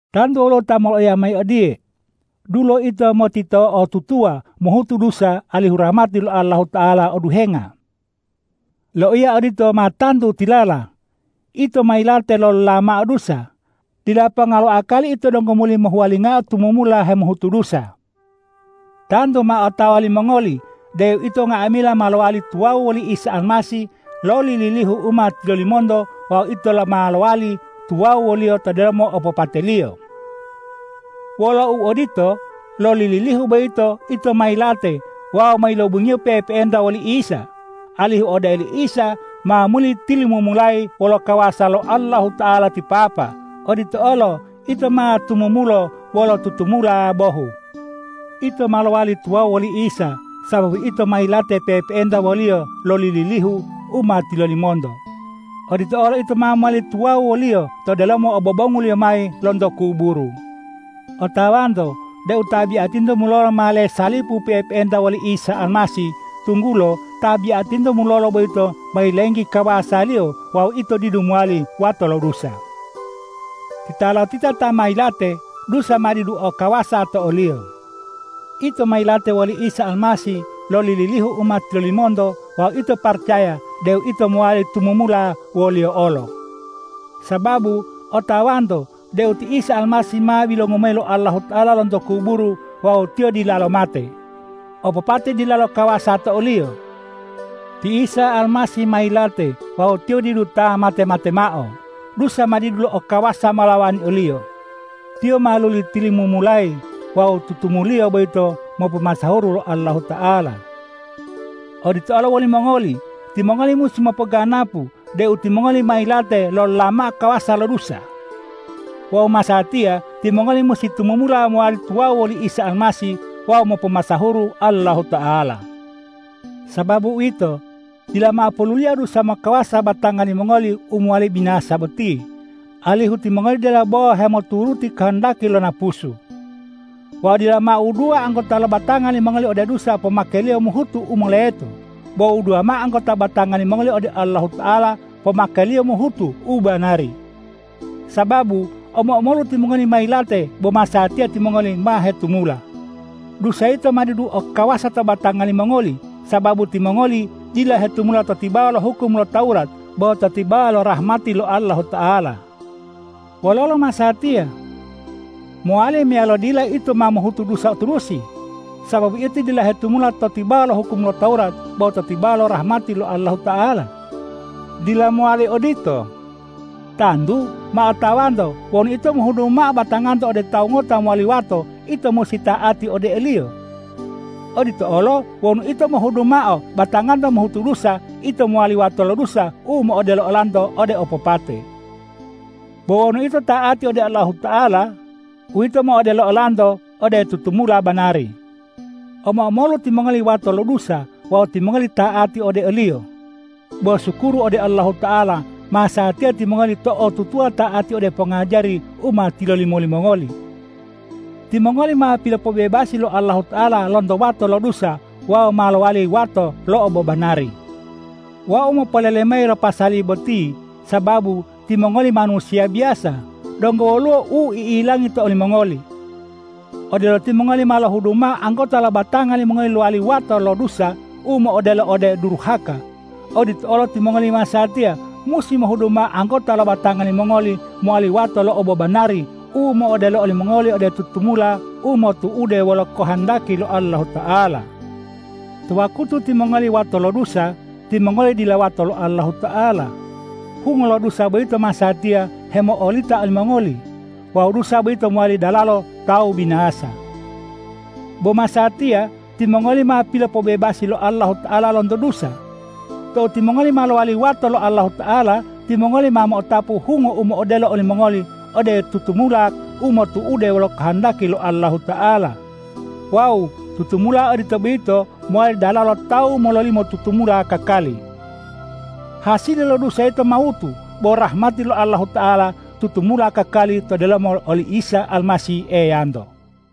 Tantu woluwo ta moloiya mayi odiye,”Dulo ito motito'otutuwa mohutu dusa alihu rahmati lo Allahuta'ala oduhenga.” Loiya odito ma tantu tilala! Ito ma yilate lolola mao dusa. Dila ponga lo akali ito donggo muli mohuwalingao tumumula hemohutu dusa. Tantu ma otawa limongoli deu ito nga'amila ma lowali tuwawu woli Isa Almasih loli lilihu u ma tilolimonto wawu ito olo ma lowali tuwawu wo-Liyo to delomo opopate-Liyo. Wolo uodito, loli lilihu boyito ito ma yilate wawu ma yilobungiyo pe'epe'enta woli Isa, alihu odelo ti Isa ma muli tilumumulayi wolo kawasa lo Allahuta'ala ti Papa, odito olo ito ma tumumulo wolo tutumula bohu. Ito ma lowali tuwawu woli Isa, sababu ito ma yilate pe'epe'enta wo-Liyo loli lilihu u ma tilolimonto. Odito olo ito ma mowali tuwawu wo-Liyo to delomo obobongu-Liyo mayi lonto kuburu. Otawanto deu tabiatinto mulolo ma lesalipu pe'epe'enta woli Isa Almasih, tunggulo tabiatinto mulolo boyito ma yilenggi kawasaliyo wawu ito didu mowali wato lo dusa. Titalotita ta ma yilate dusa ma didu o kawasa to oliyo. Ito ma yilate woli Isa Almasih loli lilihu u ma tilolimonto wawu ito paracaya deu ito ma mowali tumumula wo-Liyo olo. Sababu otawanto deu ti Isa Almasih ma bilongu mayi lo Allahuta'ala lonto kuburu wawu Tiyo dilalo mate. Opopate dilalo kawasa to o-Liyo. Ti Isa Almasih ma yilate wawu Tiyo didu ta mate-mate mao. Dusa ma didu o kawasa molawani o-Liyo. Tiyo ma luli tilumumulayi wawu tutumu-Liyo boyito mopomasahuru lo Allahuta'ala. Odito olo wolimongoli: Timongoli musi monganggapu deu timongoli ma yilate lolola mao kawasa lo dusa. Wawu masatiya timongoli musi tumumula mowali tuwawu woli Isa Almasih wawu mopomasahuru Allahuta'ala. Sababu uwito, dila mao poluliya dusa mokawasa batanga limongoli u mowali binasa boti, alihu timongoli dila bo hemoturuti kohondaki lo napusu. Wawu dila mao wuduwa anggota lo batanga limongoli ode dusa pomakeliyo mohutu u moleto. Bo wuduwa mao anggota batanga limongoli ode Allahuta'ala pomake-Liyo mohutu u banari. Sababu omo-omolu timongoli ma yilate bo masatiya timongoli ma hetumula. Dusa yito ma didu o kawasa to batanga limongoli, sababu timongoli dila hetumula to tibawa lo hukum lo Tawurat bo to tibawa lo rahmati lo Allahuta'ala. Wololo masatiya? Mowali meyalo dila ito ma mohutu dusa turusi, sababu ito dila hetumula to tibawa lo hukum lo Tawurat bo to tibawa lo rahmati lo Allahuta'ala? Dila mowali odito. Tantu ma otawanto wonu ito mohudu mao batanganto ode tawu ngota mowali wato, ito musi ta'ati ode oliyo. Odito olo wonu ito mohudu mao batanganto mohutu dusa, ito mowali wato lo dusa u mo'odelo olanto ode opopate. Bo wonu ito ta'ati ode Allahuta'ala, uwito mo'odelo olanto ode tutumula banari. Omo-omolu timongoli wato lo dusa wawu timongoli ta'ati ode oliyo. Bo sukuru ode Allahuta'ala, masatiya timongoli to'otutuwa ta'ati ode pongajari u ma tilolimo limongoli. Timongoli ma pilopobebasi lo Allahuta'ala lonto wato lo dusa wawu ma lowali wato lo obobanari. Wau mopolele mayi lo pasali boti, sababu timongoli manusiya biyasa, donggo woluwo u i'ilangi to olimongoli. Odelo timongoli ma lohudu mao anggota lo batanga limongoli lowali wato lo dusa u mo'odelo ode u duruhaka, odito olo timongoli masatiya musi mohudu mao anggota lo batanga limongoli mowali wato lo obobanari u mo'odelo olimongoli ode tutumula u motu'ude wolo kohondaki lo Allahuta'ala. To wakutu timongoli wato lo dusa, timongoli dila wato lo Allahuta'ala. Hungo lo dusa boyito masatiya hemo'olita olimongoli. Wawu dusa boyito mowali dalalo tawu binasa. Bo masatiya timongoli ma pilopobebasi lo Allahuta'ala lonto dusa. Tou timongoli ma lowali wato lo Allahuta'ala, timongoli ma mo'otapu hungo u mo'odelo olimongoli ode tutumula u motu'ude wolo kohondaki lo Allahuta'ala. Wawu tutumula odito boyito mowali dalalo tawu mololimo tutumula kakali. Hasili lo dusa yito mawutu, bo rahmati lo Allahuta'ala tutumula kakali to delomo oli Isa Almasih Eyanto.